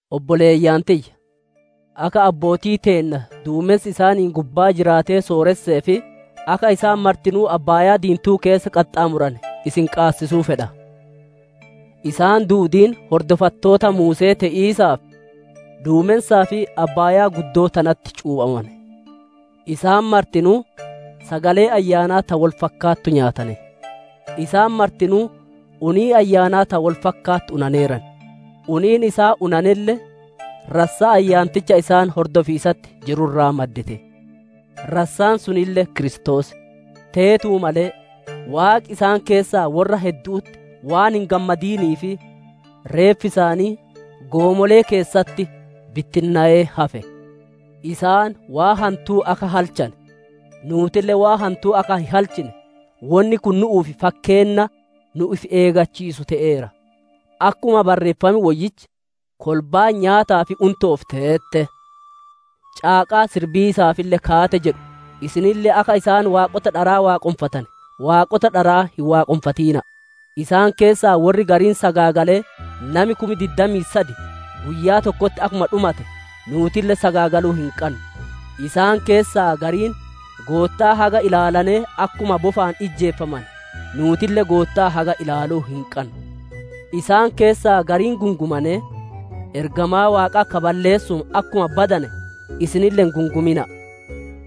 Obboleeyyan tiyya! Akka abbootii teenna duumensi isaaniin gubbaa jiraatee sooressee fi akka isaan martinuu abbaayaa diintuu keessa qaxxaamurane isin qaabachiisuu fedha. Isaan duudiin hordofattoota Muuse'ee te'iisaaf duumensaa fi Abbaayaa guddoo tanatti cuuphamane. Isaan martinuu sagalee ayyaanaa ta wol fakkaattu nyaatane. Isaan martinuu unii ayyaanaa ta wol fakkaattu unaneeran. Uniin isaan unanelle rassaa ayyaanticha isaan hordofiisatti jiru irraa maddite; rassaan sunille kiristoos. Teetuu malee, Waaqi isaan keessaa worra heddu'utti waan hin gammadiniif reeffi isaanii goomolee keessatti bittinnowee hafe. Isaan waan hantuu akka halchane, nuutille waan hantuu akka hin halchine wonni kun nu'uuf fakkeenna nu ifi eeggachiisu te'eera. Akkuma Barreeffam Woyyichi, «Kolbaan nyaataa fi unto'oof teette; caaqaa sirbiisaafille kaate» jedhu, isinille akka isaan waaqota dharaa waaqonfatane, waaqota dharaa hin waaqonfatina'a. Isaan keessaa worri gariin sagaagalee nami kum diddamii sad guyyaa tokkotti akkuma dhumate, nuutille sagaagaluu hin qannu. Isaan keessaa gariin Goottaa haga ilaalane akkuma bofaan ijjeefamane, nuutille Goottaa haga ilaaluu hin qannu. Isaan keessaa gariin gungumanee, ergamaa Waaqaa ka balleessuun akkuma badane isinille hin gungumina'a.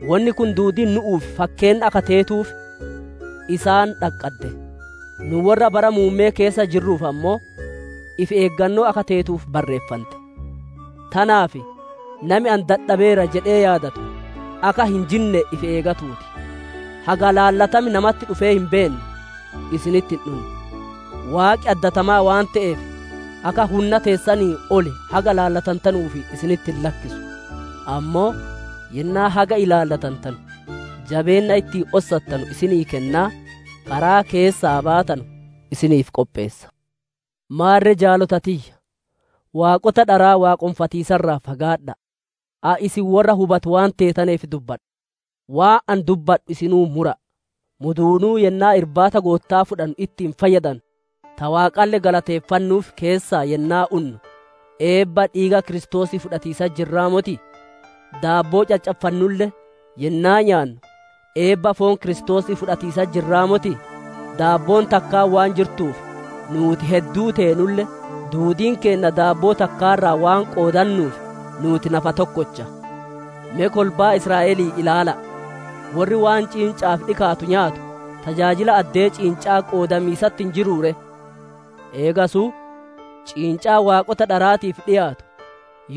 Wonni kun duudiin nu'uuf fakkeenna akka teetuuf isaan dhaqqadde; nu worra bara muumme'ee keessa jirruuf ammoo, ifi eeggannoo akka teetuuf barreeffante. Tanaaf nami ani dhaabbadheera jedhee yaadatu, akka hin jinne ifi eegatuu ti. Haga ilaallatam namatti dhufee hin beenne, isinitti hin dhunne. Waaqi addatamaa waan te'eef, akka hunna teessaniin ol haga ilaallatantanuuf isinitti hin lakkisu. Ammoo yennaa haga ilaallatantanu jabeenna ittiin ossattanu isinii kennaa, karaa keessaa baatanu isiniif qopheessa. Maarre jaalota tiyya! Waaqota dharaa waaqonfatiisa irraa fagaadha'a. Ani isin worra hubatu waan teetaneef dubbadha; waan ani dubbadhu isinuu mura'a. Muduunuu yennaa Irbaata Gootta'aa fudhannu itti fayyadannu, ta Waaqalle galateeffannuuf keessaa yennaa unnu eebba dhiiga Kiristoosii fudhatiisatti jirraa motii? Daabboo caccaffannulle yennaa nyaannu eebba foon Kiristoosii fudhatiisatti jirraa motii? Daabboon takkaan waan jirtuuf, nuuti hedduu teenulle, duudiin keenna daabboo takkaa irraa waan qoodannuuf nuuti nafa tokkocha. Me kolbaa Israa'elii ilaala'a; worri waan ciinca'aaf dhikaatu nyaatu, tajaajila addee ciinca'aa qoodamiisatti hin jiruu ree? Eegasuu, ciincaan waaqota dharaatiif dhiyaatu,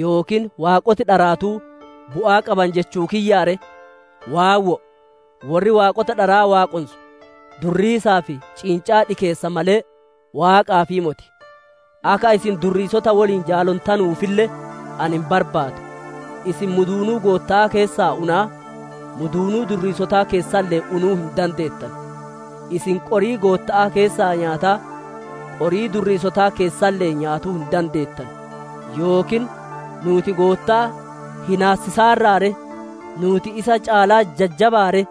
yookiin waaqoti dharaatuu bu'aa qaban jechuu kiyyaa ree? Waawwoo! Worri waaqota dharaa waaqonsu durriisaaf ciincaa dhikeessa malee, Waaqaafii moti. Akka isin durriisota woliin jaalontanuufille ani hin barbaadu. Isin muduunuu Gootta'aa keessaa unaa, muduunuu durriisotaa keessalle'ee unuu hin dandeettanu; isin qorii Gootta'aa keessaa nyaataa, qorii durriisotaa keessalle'ee nyaatuu hin dandeettanu. Yookiin nuuti Goottaa hinaassisaarraa ree? Nuuti isa caalaa jajjabaa ree?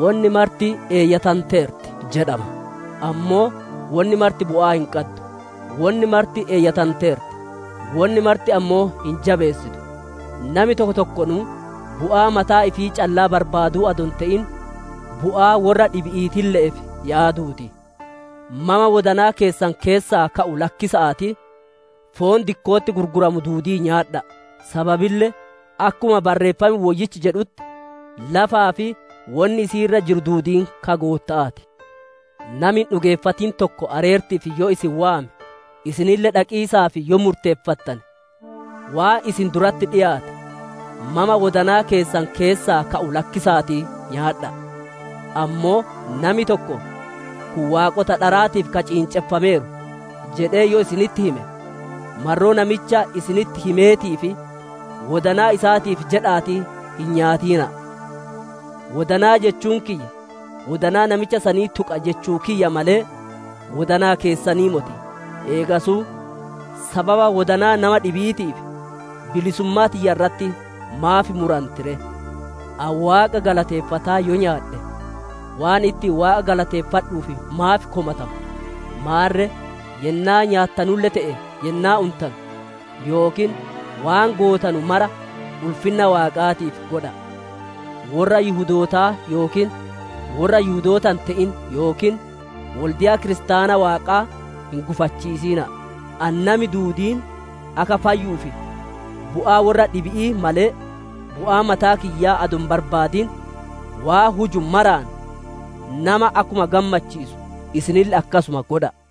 «Wonni marti eeyyatanteerti» jedhama, ammoo wonni marti bu'aa hin qaddu. Wonni marti eeyyatanteerti; wonni marti ammoo hin jabeessitu. Nami tokko tokkonuu bu'aa mataa ifii callaa barbaaduu adoo hin te'in, bu'aa worra dhibi'iitille'eef yaaduu ti. Mama wodanaa keessan keessaa ka'u lakkisa'aatii, foon dikko'otti gurguramu duudii nyaadha'a. Sababille akkuma Barreeffam Woyyichi jedhutti, «Lafaa fi wonni isii irra jiru duudiin ka Gootta'aa ti». Nami hin dhugeeffatin tokko areerti'iif yoo isin waame, isinille dhaqiisaaf yoo murteeffattane, waan isin duratti dhiyaate, mama wodanaa keessan keessaa ka'u lakkisa'aatii nyaadha'a. Ammoo nami tokko, «Kun waaqota dharaatiif ka ciinceffameeru» jedhee yoo isinitti hime, marroo namicha isinitti himeetii fi wodanaa isaatiif jedha'aatii hin nyaatina'a. Wodanaa jechuun kiyya, wodanaa namicha sanii tuqa jechuu kiyya malee, wodanaa keessanii moti. Eegasuu sababa wodanaa nama dhibi'iitiif, bilisummaa tiyya irratti maaf muranti ree? Ani Waaqa galateeffataa yoo nyaadhe, waan ittiin Waaqa galateeffadhuuf maaf komatama? Maarre yennaa nyaattanulle te'e yennaa untanu, yookiin waan gootanu mara ulfinna Waaqaatiif godha'a. Worra Yihudootaa yookiin worra Yihudoota hin te'in yookiin wolde'a Kiristaana Waaqaa hin gufachiisina'a. Ani nami duudiin akka fayyuuf bu'aa worra dhibi'ii malee, bu'aa mataa kiyyaa adoo hin barbaadin, waan huju maraan nama akkuma gammachiisu isinille akkasuma godha'a.